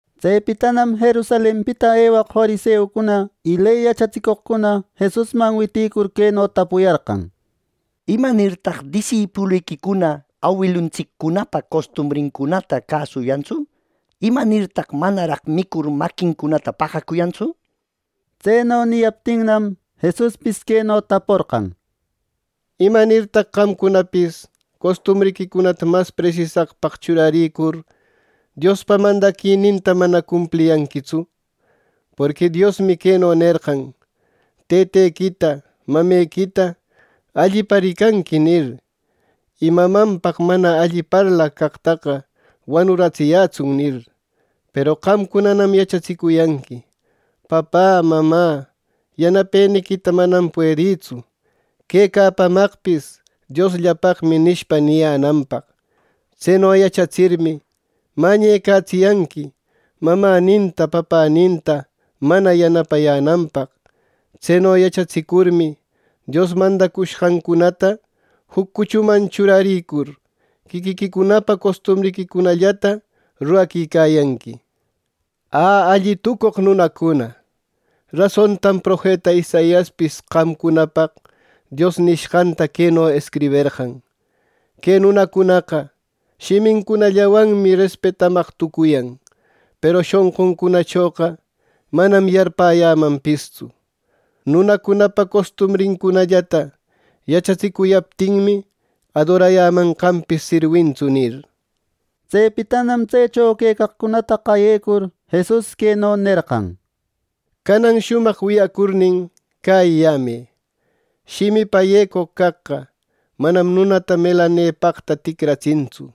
Tsepitanam Jerusalenpita ewaq fariseucuna y ley yachatsicoqcuna Jesusman witïcur queno tapuyarqan: —¿Imanirtaq disipuliquicuna awiluntsiccunapa costumbrincunata cäsuyantsu! ¿Imanirtaq manaraq micur, maquincunata paqacuyantsu! —nir. Tseno niyaptinnam, Jesuspis queno taporqan: —¿Imanirtaq qamcunapis costumbriquicunata mas presisaqpaq churaricur Diospa mandaquininta mana cumpliyanquitsu! Porqui Diosmi queno nerqan: ‘Tëtequita, mamequita allipa ricanqui’ nir. ‘Y mamanpaq mana alli parlaq caqtaqa wanuratsiyätsun’ nir. Peru qamcunanam yachatsicuyanqui, ‘Papä, mamä, yanapeniquita manam puedïtsu. Quecapamanpis Diosllapaqmi’ nishpa, niyänanpaq. Tseno yachatsirmi, mañecatsiyanqui, mamäninta papäninta mana yanapayänanpaq. Tseno yachatsicurmi, Dios mandacushqancunata juc cuchuman churarir, quiquiquicunapa costumbriquicunallata ruraquicayanqui. ¡Ä, alli tucoq nunacuna! Rasontam profeta Isaiaspis qamcunapaq Dios nishqanta queno escriberqan: ‘Que nunacunaqa shimincunallanwanmi respetamaq tucuyan; Peru shonquncunachoqa manam yarpäyämanpistsu. Nunacunapa costumbrincunallata yachatsicuyaptinmi, adorayämanqanpis sirwintsu’ nir. Tsepitanam tsecho quecaqcunata qayecur Jesus queno nerqan: —¡Canan shumaq wiyacurnin, cäyiyämë! Shimipa yecoq caqqa manam nunata melanepaqta ticratsintsu;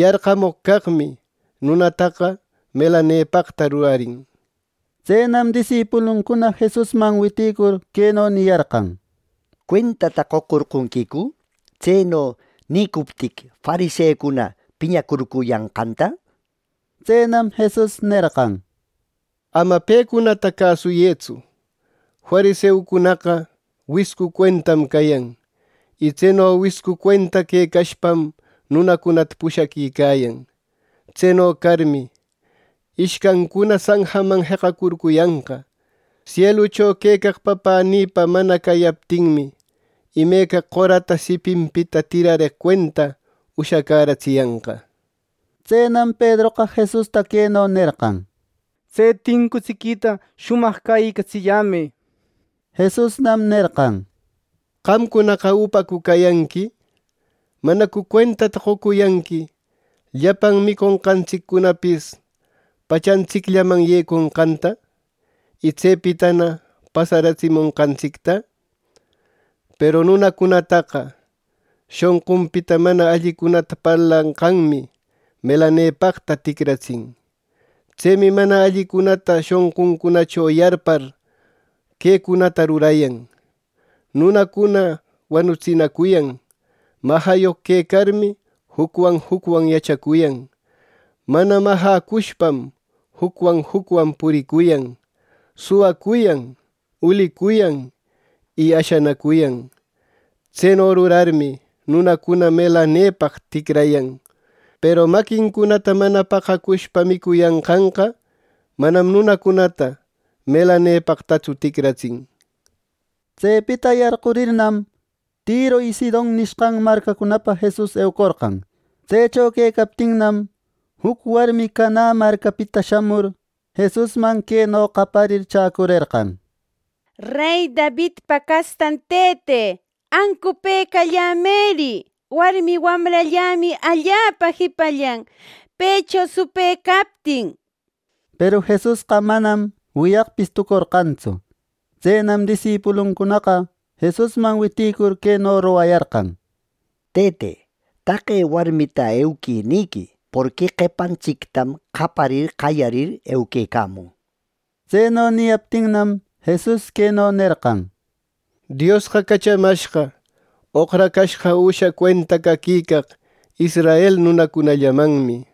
yarqamoq caqmi nunataqa melanepaqta rurarin —nir. Tsenam disipuluncuna Jesusman witïcur queno niyarqan: —¿Cuentata qocorqonquicu tseno nïcuptiqui, fariseucuna piñacurcuyanqanta? —nir. Tsenam Jesus nerqan: —¡Ama pecunata cäsuyëtsu! Fariseucunaqa wiscu cuentam cayan, y tseno wiscu cuenta quecashpam nunacunata pushaquicayan. Tseno carmi, ¡ishcancuna sanjaman jeqacurcuyanqa! Sielucho quecaq Papänïpa mana cayaptinmi, imeca qorata sipinpita tirareq cuenta ushacäratsiyanqa —nir. Tsenam Pedroqa Jesusta queno nerqan: —Tse tincutsiquita shumaq cäyicatsilläyämë —nir. Jesusnam nerqan: —¿Qamcunaqa upacu cayanqui! ¿Manacu cuentata qocuyanqui llapan miconqantsiccunapis pachantsicllaman yeconqanta, y tsepitana pasaratsimonqantsicta! Peru nunacunataqa shonqunpita mana allicunata parlanqanmi melanepaqta ticratsin. Tsemi mana allicunata shonquncunacho yarpar quecunata rurayan: nunacuna wanutsinacuyan, majayoq quecarmi jucwan jucwan yachacuyan, mana majäcushpam jucwan jucwan puricuyan, suwacuyan, ulicuyan y ashanacuyan. Tseno rurarmi, nunacuna melanepaq ticrayan; peru maquincunata mana paqacushpa micuyanqanqa, manam nunacunata melanepaqtatsu ticratsin. Tsepita yarqurirnam, Tiro y Sidon nishqan marcacunapana Jesus eucorqan. Tsecho quecaptinnam, juc warmi Canä marcapita shamur, Jesusman queno qayarir chäcurerqan: —Rey Davidpa castan Tëte, ¡ancupëcallämëri! Warmi wamrallämi allapa jipallan, pëcho supë captin —nir. Peru Jesusqa manam ni wiyaqpis tucorqantsu. Tsenam disipuluncunanaqa Jesusman witïcur queno rogayarqan: —Tëte, taqe warmita ‘Euquï’ nïquï, porqui qepantsictam qaparir, qayarir euquecämun —nir. Tseno niyaptinnam, Jesus queno nerqan: —Diosqa cachamashqa oqracashqa üsha cuenta caquicaq israel nunacunallamanmi —nir.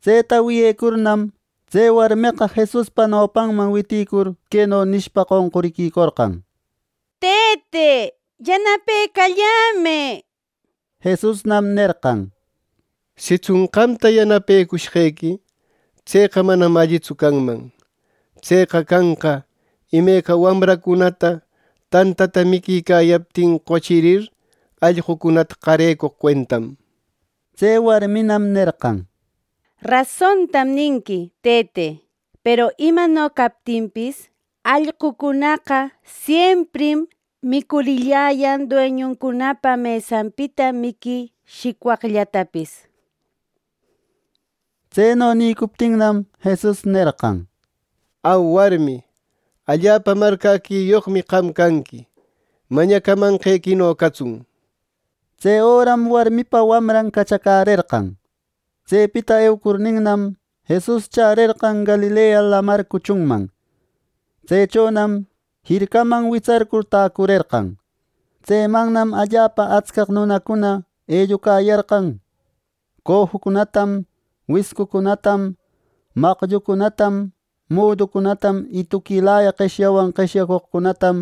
Tseta wiyecurnam, tse warmeqa Jesuspa nopanman witïcur queno nishpa qonquriquicorqan: —Tëte, ¡Yanapecallämë! —nir. Jesusnam nerqan: —Sitsun qamta yanapecushqequi, ¡tseqa manam allitsu canman! Tseqa canqa imeca wamracuna tantata miquicayaptin qochirir, allqucunata qarecoq cuentam —nir. Tse warminam nerqan: —Rasontam ninqui, tëte. Peru imano captinpis, allqucunaqa siemprim micurilläyan dueñuncunapa mesanpita miqui shicwaqllatapis —nir. Tseno nïcuptinnam, Jesus nerqan: —Au, warmi, ¡Allapa marcäquiyoqmi qam canqui! Mañacamanqequino catsun —nir. Tse öram warmipa wamran cachacärerqan. Tsepita eucurninam, Jesus chärerqan Galilea Lamar cuchunman. Tsechonam jircaman witsarcur täcurerqan. Tsemannam allapa atscaq nunacuna ellucayarqan. Cojucunatam, wiscucunatam, maqllucunatam, muducunatam y tuquilaya qeshyawan qeshyacoqcunatam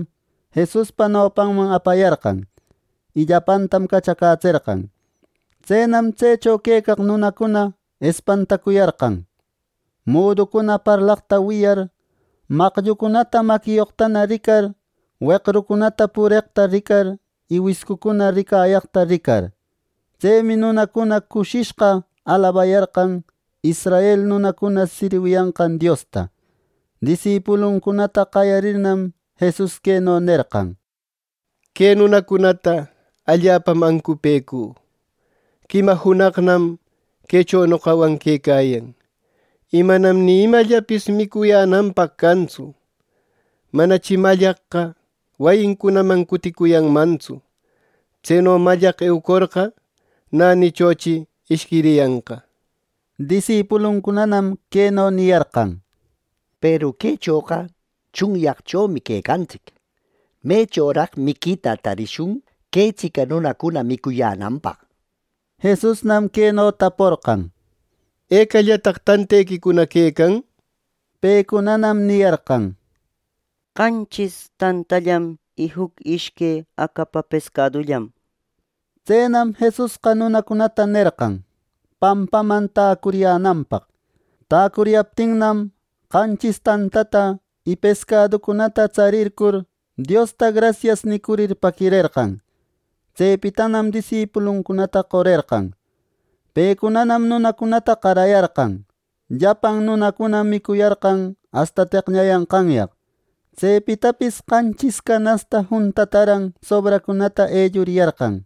Jesuspa nopanman apayarqan, y llapantam cachacätserqan. Tsenam tsecho quecaq nunacuna espantacuyarqan, muducuna parlaqta wiyar, maqllucunata maquiyoqtana ricar, weqrucuna pureqta ricar y wiscucuna ricayaqta ricar. Tsemi nunacuna cushishqa alabayarqan israel nunacuna sirwiyanqan Diosta. Disipuluncunata qayarirnam, Jesus queno nerqan: —Que nunacunata allapam ancupëcü. Quima junaqnam quecho noqawan quecayan; y manam ni imallapis micuyänanpaq cantsu. Manachi mallaqqa wayincunaman cuticuyanmantsu. Tseno mallaq eucorqa, nänichochi ishquiriyanqa —nir. Disipuluncunanam queno niyarqan: —Peru quechoqa tsunyaqchomi quecantsic. ¿Mechoraq miquita tarishun quetsica nunacuna micuyänanpaq! —nir. Jesusnam queno taporqan: —¿Ecallataq tantequicuna quecan? —nir. Pecunanam niyarqan: —Qanchis tantallam y juc ishque acapa pescadullam —nir. Tsenam Jesusqa nunacunata nerqan pampaman täcuriyänanpaq. Täcuriyaptinnam, qanchis tantata y pescaducunata tsarircur, Diosta “grasias” nicurir paquirerqan. Tsepitanam disipuluncunata qorerqan. Pecunanam nunacunata qarayarqan. Llapan nunacunam micuyarqan asta teqñayanqanyaq. Tsepitapis qanchis canasta juntataran sobraqcunata elluriyarqan.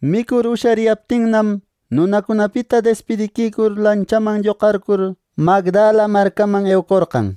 Micur ushariyaptinnam, nunacunapita despidiquicur, lanchaman lloqarcur Magdala marcaman eucorqan.